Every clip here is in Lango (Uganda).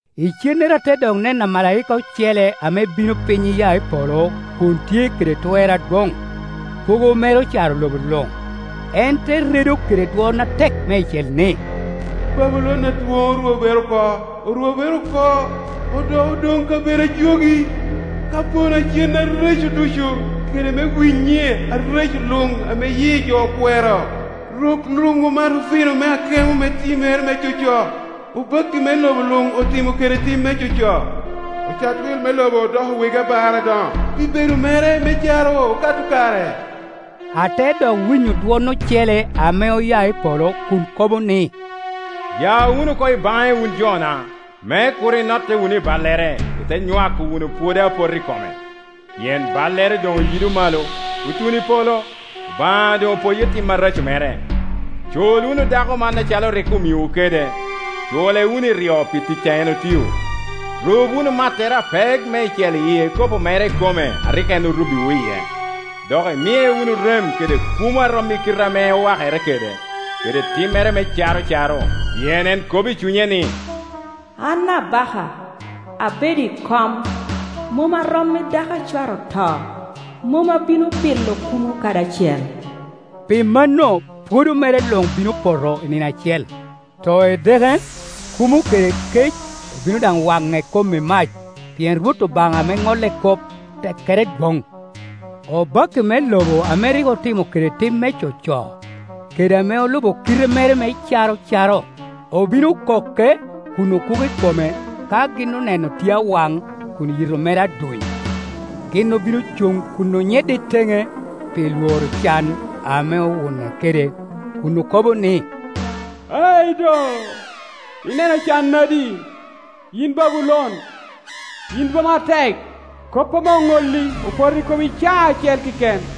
Icennere ate dok neno amalaika ocele ame bino piny iya i polo kun tye kede twer adwoŋ; kwogo mere ocaro lobo luŋ. En te redo kede dwon atek meicel ni, “Babulon adwoŋ orwobere oko, orwobere oko! Odoko doŋ kabedo a jogi, ka-pono a cen areco ducu kede me winyi areco luŋ ame yi jo kwero. Rok luŋ omato vino me akemo me timmere me coco, obakki me lobo luŋ otimo kede tim me coco, ocat-wil me lobo odoko wegi abar adoŋo pi bedo mere me caro okato kare.” Ate dok winyo dwon ocele ame oya i polo kun kobo ni, “Ya wunu oko i baŋe, wun jona, me kur inotte wunu i ballere, ite nywako wunu pwodo a poto i kome! Pien ballere doŋ oyido malo, otuno i polo, Obaŋa doŋ opoyo tim areco mere, Cul wunu dako man acalo rik omiowu kede, cule wunu iryo pi tic a en otio, rub wunu mattere apek meicel ikopo mere ikome a rik en orubbiwu iye. Dok imiye wunu rem kede kumo a rom i kite ame owakere kede, kede timmere me caro caro, Pien en kobo i cunye ni, ‘An abaka, abedo i kom, mom a rom i dako a cware oto, mom abino bilo kumo kadi acel,’ pi mano pwodo mere luŋ bino poto i nino acel, too edeke, kumo kede kec. Obino daŋ wane kom i mac, pien Rwot Obaŋa ame ŋolle kop tekkere dwoŋ.” Obakki me lobo ame rik otimo kede tim me coco, kede ame olubo kite mere me caro caro obino koke kun okuko i kome ka gin oneno tye awan kun yito mere aduny. Gin obino cuŋ kun onyedde i teŋe pi lworo can ame owune kede, kun oko bo ni, “Ai do, ineno can nadi, yin Babulon, yin boma atek! Kop ame oŋolli opoto i komi i caa acel keken.”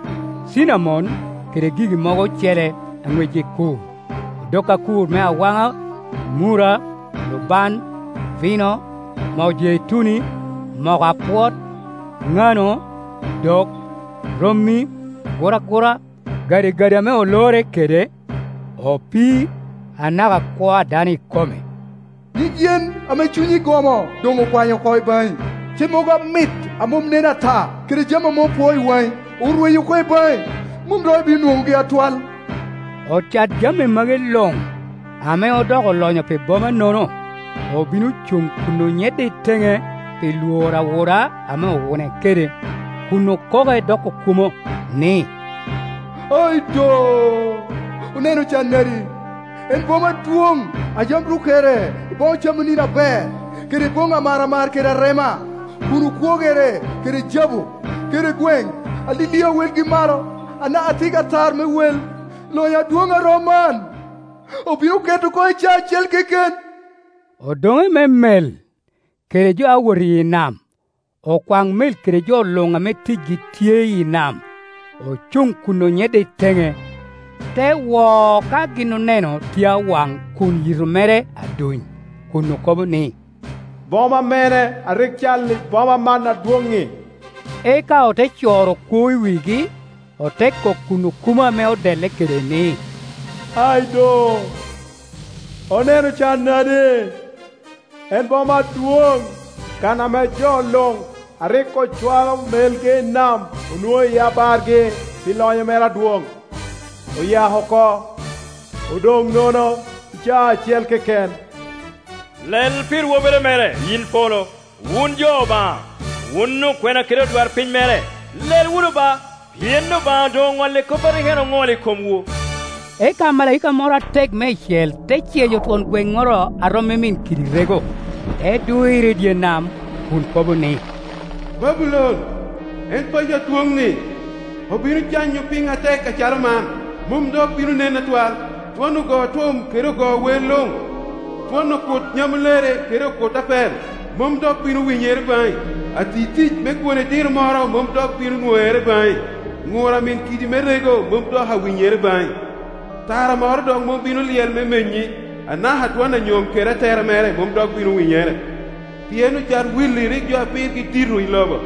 cinamon kede gigi mogo ocele a ŋwecgi kur, odok akur me awana, murra, lubaŋ, vino, moo jeituni, moko apwot, ŋano, dok, rommi, aguragura, gadigadi ame olorre kede, opii, anaka kwo a dano ikome. “Nyig yen ame cunyi gomo doŋ okwanyo oko i baŋi, cemmogo amit a mom nen ata kede jami ame opwoo i waŋ, orwenyo oko i baŋi, mom dok ibino nwoŋogi atwal!” Ocat jami magi luŋ, ame odoko olonyo pi boma-no no, obino cuŋ kun onyedde i teŋe pi lworo awuna ame owune kede, kun okoke dok okumo, ni “Ai do, oneno can nadi, en boma adwoŋ, a yam rukere i bono camanini aber, kede boŋŋi amaramar kede arema, kun okwogere kede jabu kede gweŋ alilia a welgi malo, anaka tiggi atar me wei! Lonyo adwoŋ a rom man obin oketo oko i caa acel keken.” Odoŋe me mel, kede jo a wot i nam, okwaŋ mel kede jo luŋ ame ticgi tye i nam, ocuŋ kun onyedde i teŋe, te wo ka gin oneno tye awan kun yito mere aduny, kun okobo ni, “Boma me ne a rik cal i boma man adwoŋ-ŋi?” Eka ote coro kwoo i wigi, ote kok kun oku mo ame odelle kede ni, “Ai do, oneno can nadi, en boma adwoŋ, kan ame jo luŋ a rik ocwalo melegi i nam onwoŋo iye abargi pi lonyo mere adwoŋ! Oyako oko, odoŋ nono, i caa acel keken, Lel pi rwobere mere, yin polo, wun jo Obaŋa, wun okwena kede odwarpiny mere, lel wunu ba, pien Obaŋa doŋ oŋolle kop a rik en oŋolo i komwu!” Eka amalaika moro atek meicel te ceyo twon gweŋŋoro a rom i min kidi rego, te dwiro i dye nam, kun ko bo ni, “Babulon, en paco adwoŋ-ŋi, obino canyo piny atek acalo man, mom dok bino nen atwal! Dwon ogo-tum kede ogo wer luŋ, dwon okut nyamulere kede okut apel, mom dok bino winyere baŋi. Ati-tic me kwone diro moro mom dok bino nwoŋere baŋi. Ŋur a min kidi me rego mom dok awinyere baŋi, Tara moro mom dok bino Iyel me menyi, anaka dwon anyom kede atera mere mom dok bino winyere; pien ocat-willi rik jo a pirgi dito i lobo,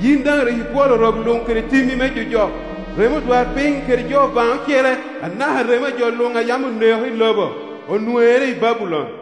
yin daŋ rik ibwolo rok luŋ kede timmi me jojok. Remo odwarpiny kede jo Obaŋa ocele, anaka remo a jo luŋ a yam oneko i lobo, onwoŋere i Babulon.”